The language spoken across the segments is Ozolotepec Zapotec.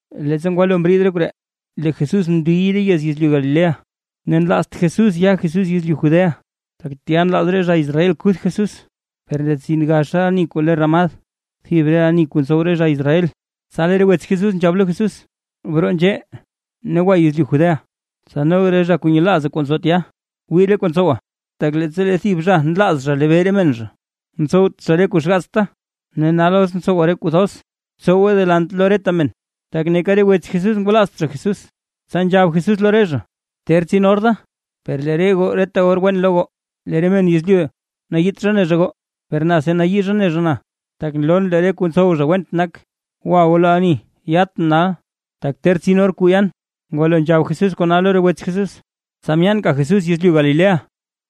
Leettsa ngwalo mriid re koree, lee Jesús mndiy re yez yezlyu Galilea ne nlaazt Jesús ya Jesús yezlyu Judea, tak tya nlaaz re zha Israel kuth Jesús. Per ndetsin gaxa ani kuu le Ramad, thib re ani kuu ntsow re zha Israel, tsa lee re wets Jesús nzhab lo Jesús: ―Broo nzhee, ne gwa yezlyu Judea, tsa noga re zha kuu nyelaaza kuu nzo tya, wii re kuu ntsowa. Tak leettsa lee thib zha nlaaz zha lebee re men zha, ntsowt zha re kuu xgaatsta. Ne nal os ntsowa re kuu thoz, btsowe delant lo reta men. Tak neeka re wets Jesús ngwalaazt zha Jesús. Tsa nzhab Jesús lo re zha: ―Ter tsin or da, per lee re goo reta or wen lo goo. Lee re men yezlyu nayiit zha ne zha goo, per na si nayii zha ne zha na, tak nloon lee re kuu ntsow zha went nak. Gwa goo lo ani yatʼn nal, tak ter tsin or kuu yan. Ngwalo nzhab Jesús kona lo re wets Jesús, tsa myaanka Jesús yezlyu Galilea.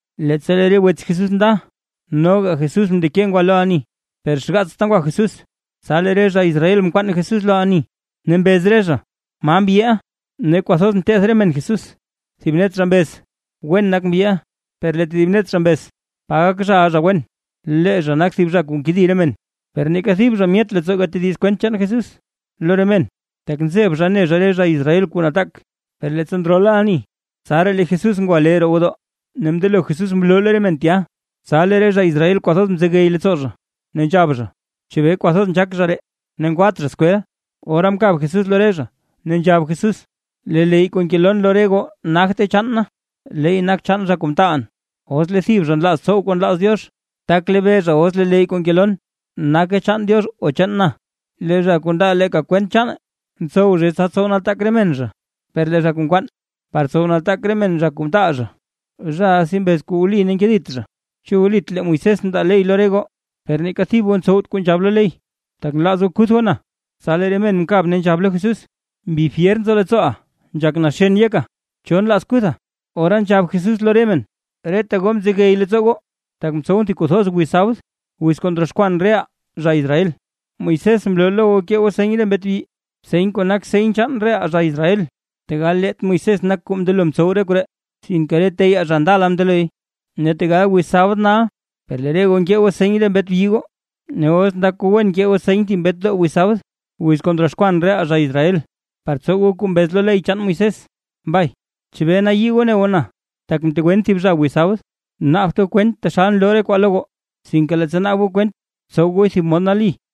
Leettsa lee re wets Jesús nda, noga Jesús mndeke ngwa lo ani, per xgaatsta ngwa Jesús. Tsa lee re zha Israel mkwaan Jesús lo ani, ne mbez re zha: ―¿Ma mbyiʼa? Ne kwathoz nteth re men Jesús. Thib net zha mbez: “Wen nak mbyiʼa”; per lee tedib net zha mbez: “Pa gak zhaʼa zha wen, lee zha nak thib zha kuu nkedi re men”. Per neeka thib zha myet leettsoo gatediz kwent chaan Jesús lo re men, tak nzeb zha ne zha re zha Israel kuu nataak. Per leettsa ndrola ani, tsaraa lee Jesús ngwa lee roo gwodoo, ne mndelo Jesús mloo lo re men tya. Tsa lee re zha Israel kwathoz mzegey leettsoo zha, ne nzhab zha: ―¿Chebee kwathoz nzhaak zha ree, ne ngwat zha skwel? Ora mkab Jesús lo re zha, ne nzhab Jesús: ―Lee leyy kuu ngeloon lo re goo nagte chaan na, leey nak chaan zha kuu mtaalʼn. Os lee thib zha nlaaz tsow kuu nlaaz Diox, tak lebee zha os lee leyy kuu ngeloon nake chaan Diox o chaan na. Lee zha kuu ndaa leeka kwent chaane, ntsow zhay tsa tsow nataak re men zha, per lee zha kuu nkwaan par tsow nataak re men zha kuu mtaal zha, zhaʼa si mbez kuu wli ne nkedit zha. ’¿Chu wlit lee Moisés mndaa ley lo re goo? Per neeka thib goo ntsowt kuu nzhab lo ley. ¿Tak nlaaz goo kuth goo na? Tsa lee re men mkab ne nzhab lo Jesús: ―¡Mbi fyer nzo leettsooʼa, nzhak naxen yeka! ¿Cho nlaaz kutha? Ora nzhab Jesús lo re men: ―Reta goo mzegey leettsoo goo, tak mtsowʼn thib kuu thoz wiz sabd, wiz kuu ndroxkwan reʼaa zha Israel. Moisés mloo lo goo kee goo seny ree mbet byi, seny kuu nak seny chaan reʼaa zha Israel (tegal leet Moisés nak kuu mndelo mtsow koree, sinke re teyaa zha ndala mndeloy), ne tegal wiz sabd nal per lee re goo nkee goo seny re mbet byi goo. Ne os ndak goo wen kee goo seny thib mbetdoo wiz sabd, wiz kuu ndroxkwan reʼaa zha Israel, par tsow goo kuu mbez lo ley chaan Moisés, mbay ¿chebee nayii goo ne goo na, tak mtegwen thib zha wiz sabd tsa? Naabt goo kwent taxal nloo re kwaa lo goo, sinke leettsa naab goo kwent, btsow goo thib mod nali.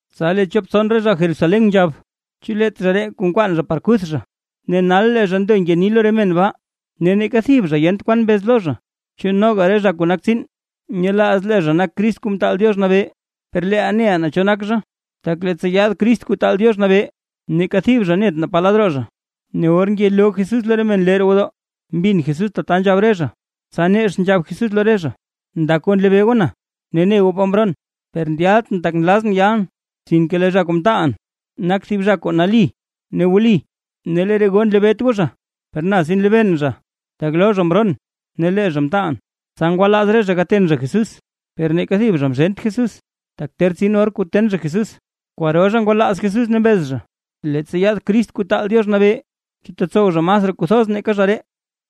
Tsa lee chop tson re zha Jerusalén nzhab: ―¿Chu leet zha ree kuu nkwaan zha par kuth zha? Ne nal lee zha ndo ngeni lo re men baa, ne neeka thib zha yent kwan mbez lo zha. ¿Chu noga re zha kuu nak tsiin nyelaaz lee zha nak Crist Kuu Mtaal Diox Nabee? Per leeʼaa neʼaa naa cho nak zha, tak leettsa yaad Crist Kuu Taal Diox Nabee, neeka thib zha net naa pa lad roo zha. Ne or ngeloo Jesús lo re men lee roo gwodoo, mbin Jesús tata nzhab re zha, tsa nex nzhab Jesús lo re zha: ―¡Ndak goo nlebee goo na, ne ne goo pa mroon! Per ndyaltʼn tak nlazʼn yalʼn, sinke lee zha kuu mtaalʼn, nak thib zha kuu nali ne wli, ne lee re goo nlebeet goo zha. Per na si nlebeen zha, tak lo zha mroon ne lee zha mtaalʼn. Tsa ngwalaaz re zha gaten zha Jesús, per neeka thib zha mzhent Jesús, tak ter tsin or kuu ten zha Jesús. Kwaro zha ngwalaaz Jesús ne mbez zha: ―Leettsa yaad Crist Kuu Taal Diox Nabee, ¿chu tetsow zha masraa kuu thoz nake zha ree?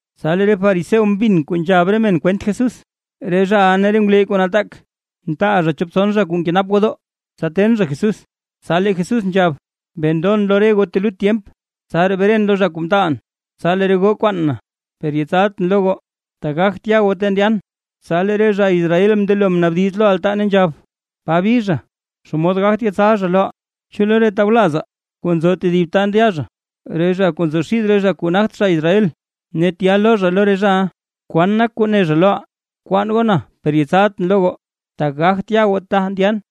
Tsa lee re fariseo mbin kuu nzhab re men kwent chaan Jesús, re zhaʼa ne re ngwleyy kuu nataak, mtaal zha chop tson zha kuu nkenap gwodoo, tsa ten zha Jesús. Tsa lee Jesús nzhab: ―Bee ndon lo re goo telut tyemp, tsaraa bren lo zha kuu mtaalʼn. Tsa lee re goo kwaan na, per yetsaltʼn lo goo, tak gagt ya goo ta ndyan. Tsa lee re zha Israel mndelo mnaabdiz lo re altaa nzhab: ―¿Pa bi zha, xomod gagt yetsal zha loʼaa? ¿Chu lo re tawlazaa kuu nzo tedib ta ndya zha, re zha kuu nzo xid re zha kuu nagt zha Israel ne tya loo zha lo re zhaʼa? ¿Kwan nak kuu ne zha loʼaa: “Kwaan goo na per yetsaltʼn lo goo, tak gagt ya goo ta ndyan”?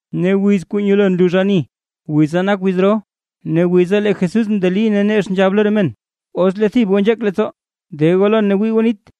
Ne wiz kuu nyelo nlux ani wiza nak wiz ro. Ne wiza lee Jesús mndeli ne nex nzhab lo re men: ―¿Os lee thib goo nzheek leettsoo, de goo lon ne gwii goo nit?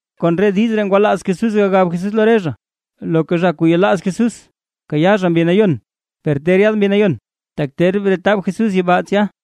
Kon re diiz ree ngwalaaz Jesús gagab Jesús lo re zha: Loka zha kuu yelaaz Jesús, kayaa zha Mbi Nayon, per ter yaad Mbi Nayon, tak ter bretab Jesús yibaa tsya.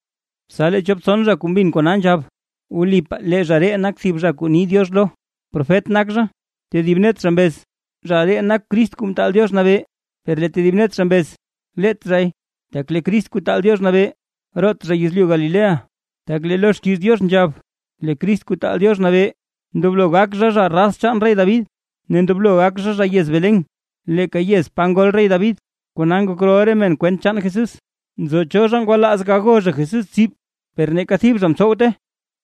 Tsa lee chop tson zha kuu mbin kona nzhab: ―Wlipaa lee zha ree nak thib zha kuu ni Diox lo, profet nak zha. Tedib net zha mbez: ―Zha ree nak Crist Kuu Mtaal Diox Nabee. Per lee tedib net zha mbez: ―Leet zhay, tak lee Crist Kuu Taal Diox Nabee, root Zha yezlyu Galilea. Tak lee lo xkiiz Diox nzhab lee Crist Kuu Taal Diox Nabee, ndoblo gak zha, zha raz chaan rey David, ne ndoblo gak zha, zha yez Belén, leeka yez pa ngol rey David. Kona ngok rol re men kwent chaan Jesús. Nzo cho zha ngwalaaz gago zha Jesús tsib, per neeka thib zha mtsowte.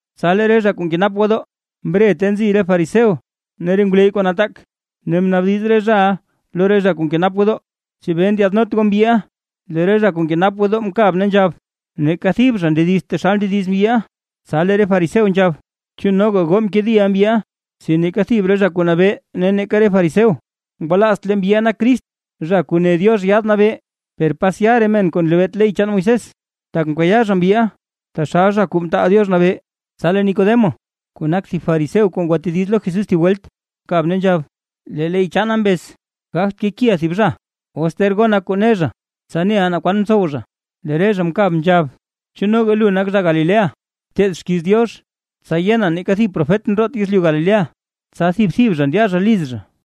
Tsa lee re zha kuu nkenap gwodoo mre ta nzi re fariseo ne re ngwleyy kuu nataak, ne mnaabdiz re zhaʼa lo re zha kuu nkenap gwodoo: ―¿Chebee ndyaadnot goo mbyiʼa? Lee re zha kuu nkenap gwodoo mkab ne nzhab: ―¡Neeka thib zha ndedizt taxal ndediz mbyiʼa! Tsa lee re fariseo nzhab: ―¿Chu noga goo mkediʼa mbyiʼa? Si neeka thib re zha kuu nabee ne neeka re fariseo, ngwalaazt lee mbyiʼa nak Crist, Zha Kuu Ne Diox Yaad Nabee. Per pasya re men kuu nlebeet ley chaan Moisés, tak mkayaa zha mbyiʼa taxal Zha Kuu Mtaal Diox Nabee. Tsa lee Nicodemo, kuu nak thib fariseo kuu ngwatediz lo Jesús thib welt, mkab ne nzhab: ―Lee ley chaanaa mbez: Gagt kekiʼaa thib zha, os ter gonaa kuu ne zha, tsa neʼaa naa kwan mtsow zha. Lee re zha mkab nzhab: ―¿Chu noga lu nak zha Galilea? Bteed xkiiz Diox, tsa yena neeka thib profet ndroot yezlyu Galilea. Tsa kadta thib thib zha ndya zha liz zha.